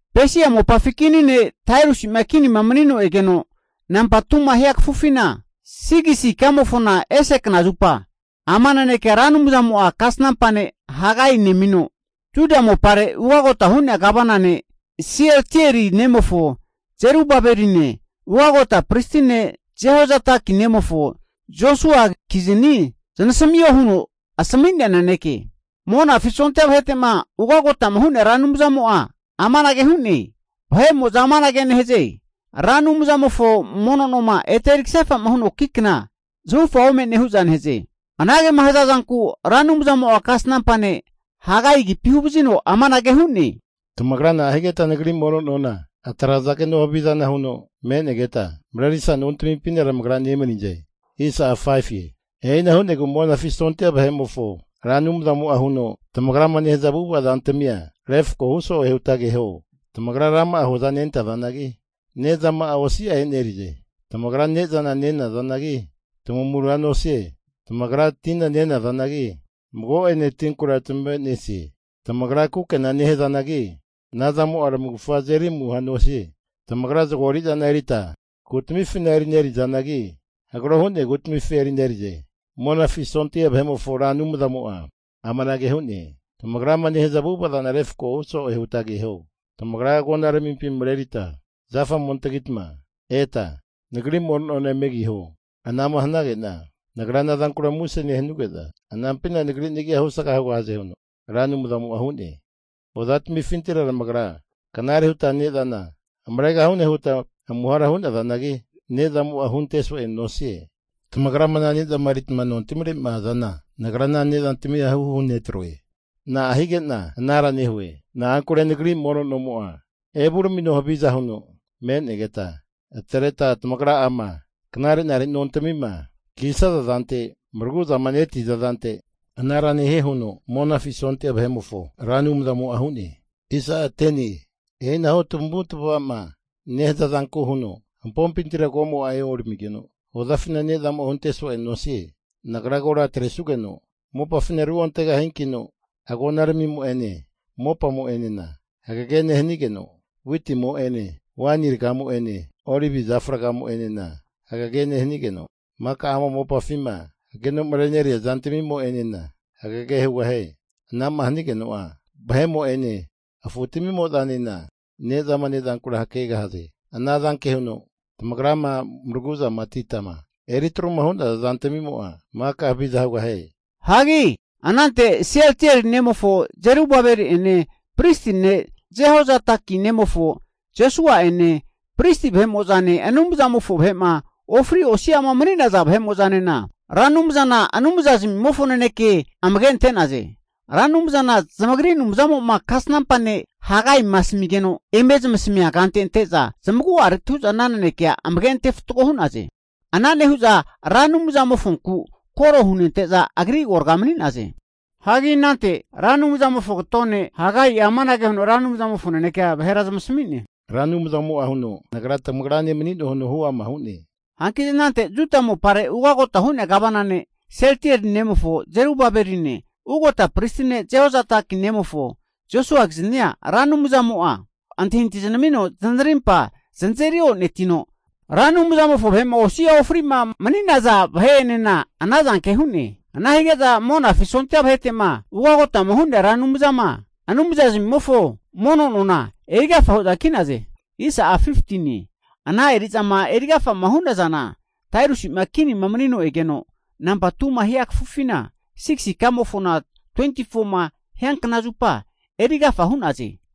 Pesia mopafi kini ne' Dariusi'ma kinima manino egeno nampa 2ma hia kafufina, 6si ikamofona ese knazupa, ama nanekea Ra Anumzamo'a kasnampa ne' Hagaina nemino, Juda mopare ugagota hu'nea Gavana ne', Sieltieli nemofo Zerubabeline, ugagota Pristi ne' Jehozadaki nemofo Josuakizani zanasamio huno asami'nea naneke. Monafi sondia vahete'ma ugagotama hu'nea Ra Anumzamo'a amanage hu'ne. Vahe'mo'za amanage nehaze, Ra Anumzamofo mono noma ete eri kasefa'ma huno ki kna zahufa ome'ne hu'za nehaze. Anagema hazazanku Ra Anumzamo'a kasnampa ne' Hagai agipi huvazino amanage hu'ne, Tamagra na'a higeta Nagri mono nona atrazageno havizana huno me'negeta, marerisa nontamimpina tamagra nemanize? E'ina hu'negu Monafi sondia vahe'mofo Ra Anumzamo'a huno, tamagrama nehaza avu'ava zantamia refkohu so'e huta keho. Tamagra rama'a hoza nentazanagi, nezama'a osi'a e'nerize. Tamagra ne'zana nenazanagi, tamamura nosie. Tamagra tina nenazanagi, mago'ene tinkura tamave'nesie. Tamagra kukena nehazanagi, anazamo'a tamavufga azeri amuhoa nosie. Tamagra zago eri'zana erita kutamifina erinerizanagi, hagro hu'nea kutamifi erinerize. Monafi sondia vahe'mofo Ra Anumzamo'a amanage hu'ne. Tamagrama nehaza avu'ava zana refkohu so'e huta keho. Tamagra agonaramimpi marerita zafa ome antagita eta Nagri mono nona eme kiho. Ana'ma hanage'na Nagra anazankura muse nehanuge'za, anampina Nagri nagia husga hugahaze huno Ra Anumzamo'a hu'ne. Hozafintira tamagra knare huta ne'zana hamaregahune huta amuhara hu'nazanagi, ne'zamo'a hunte so'e nosie. Tamagra ana ne'zama erita nontamire'ma azana, Nagra ana ne'zantamina huhu hunetroe. Na'a hige'na anara nehue? Na'ankure Nagri mono nomo'a evuramino haviza huno me'negeta, atreta tamagra'ama knare'nare nontamima kisaza zante maragu'zama neti'za zante, anara nohue huno Monafi sondia vahe'mofo Ra Anumzamo'a hu'ne. E'inahu tamavu tamava'ma nehaza zanku huno, hampompintira komo'a eoramigeno, hozafina ne'zamo'a hunte so'e nosie. Nagra kora atresugeno mopafina ruontegahiankino, agonaramimo'ene mopamo'enena hagege nehanigeno, witimo'ene waini ragamo'ene olivi zafa ragamo'enena hagege nehanigeno, maka ama mopafima hageno mareneria zantamimo'enena hagege hugahie. Ana'ma hanigeno'a vahemo'ene afutamimo'zanena ne'zama ne'zankura hakegahaze. Anazanke huno tamagrama maraguzamatita eritruma hu'naza zantamimo'a maka haviza hugahie. Anante Sieltieli nemofo Zerubabeli'ene, pristi ne' Jehozadaki nemofo Josua'ene, pristi vahe'mo'zane Anumzamofo vahe'ma ofri osi'ama mani'naza vahe'mo'zanena Ra Anumzana Anumzazamimofo naneke amage ante'naze. Ra Anumzana zamagri Anumzamo'ma kasnampa ne' Hagaima asamigeno, eme zamasamia kante ante'za zamagu'areti hu'za ana nanekea amage ante fatgo hu'naze. Ana nehu'za Ra Anumzamofonku koro hunente'za Agri agorga mani'naze. Anante Ra Anumzamofo kato ne' Hagai'a amanage huno Ra Anumzamofo nanekea vahera zamasami'ne. Ra Anumzamo'a huno, Nagra tamagrane mani'noe huno huama hu'ne. Hanki anante Juda mopare ugota hu'nea Gavana ne' Sieltieli nemofo Zerubabeline, ugota pristi ne' Jehozadaki nemofo Josuakiznia Ra Anumzamo'a antahintahi zanamino zanarimpa zanazeri onetino, Anumzamofo vahe'ma osi'a ofri'ma mani'zana vahe'enena anazanke hu'ne. Ana hige'za Monafi sondia vahete'ma ugagotama hu'nea Ra Anumzama Anumzazamimofo mono nona erigafa hu'za ki'naze. Ana eri'zama eri agafama hu'nazana, Dariusi'ma kinima manino egeno nampa 2ma hia kafufina 6si ika mofona 24ma hianknazupa eri agafa hu'naze.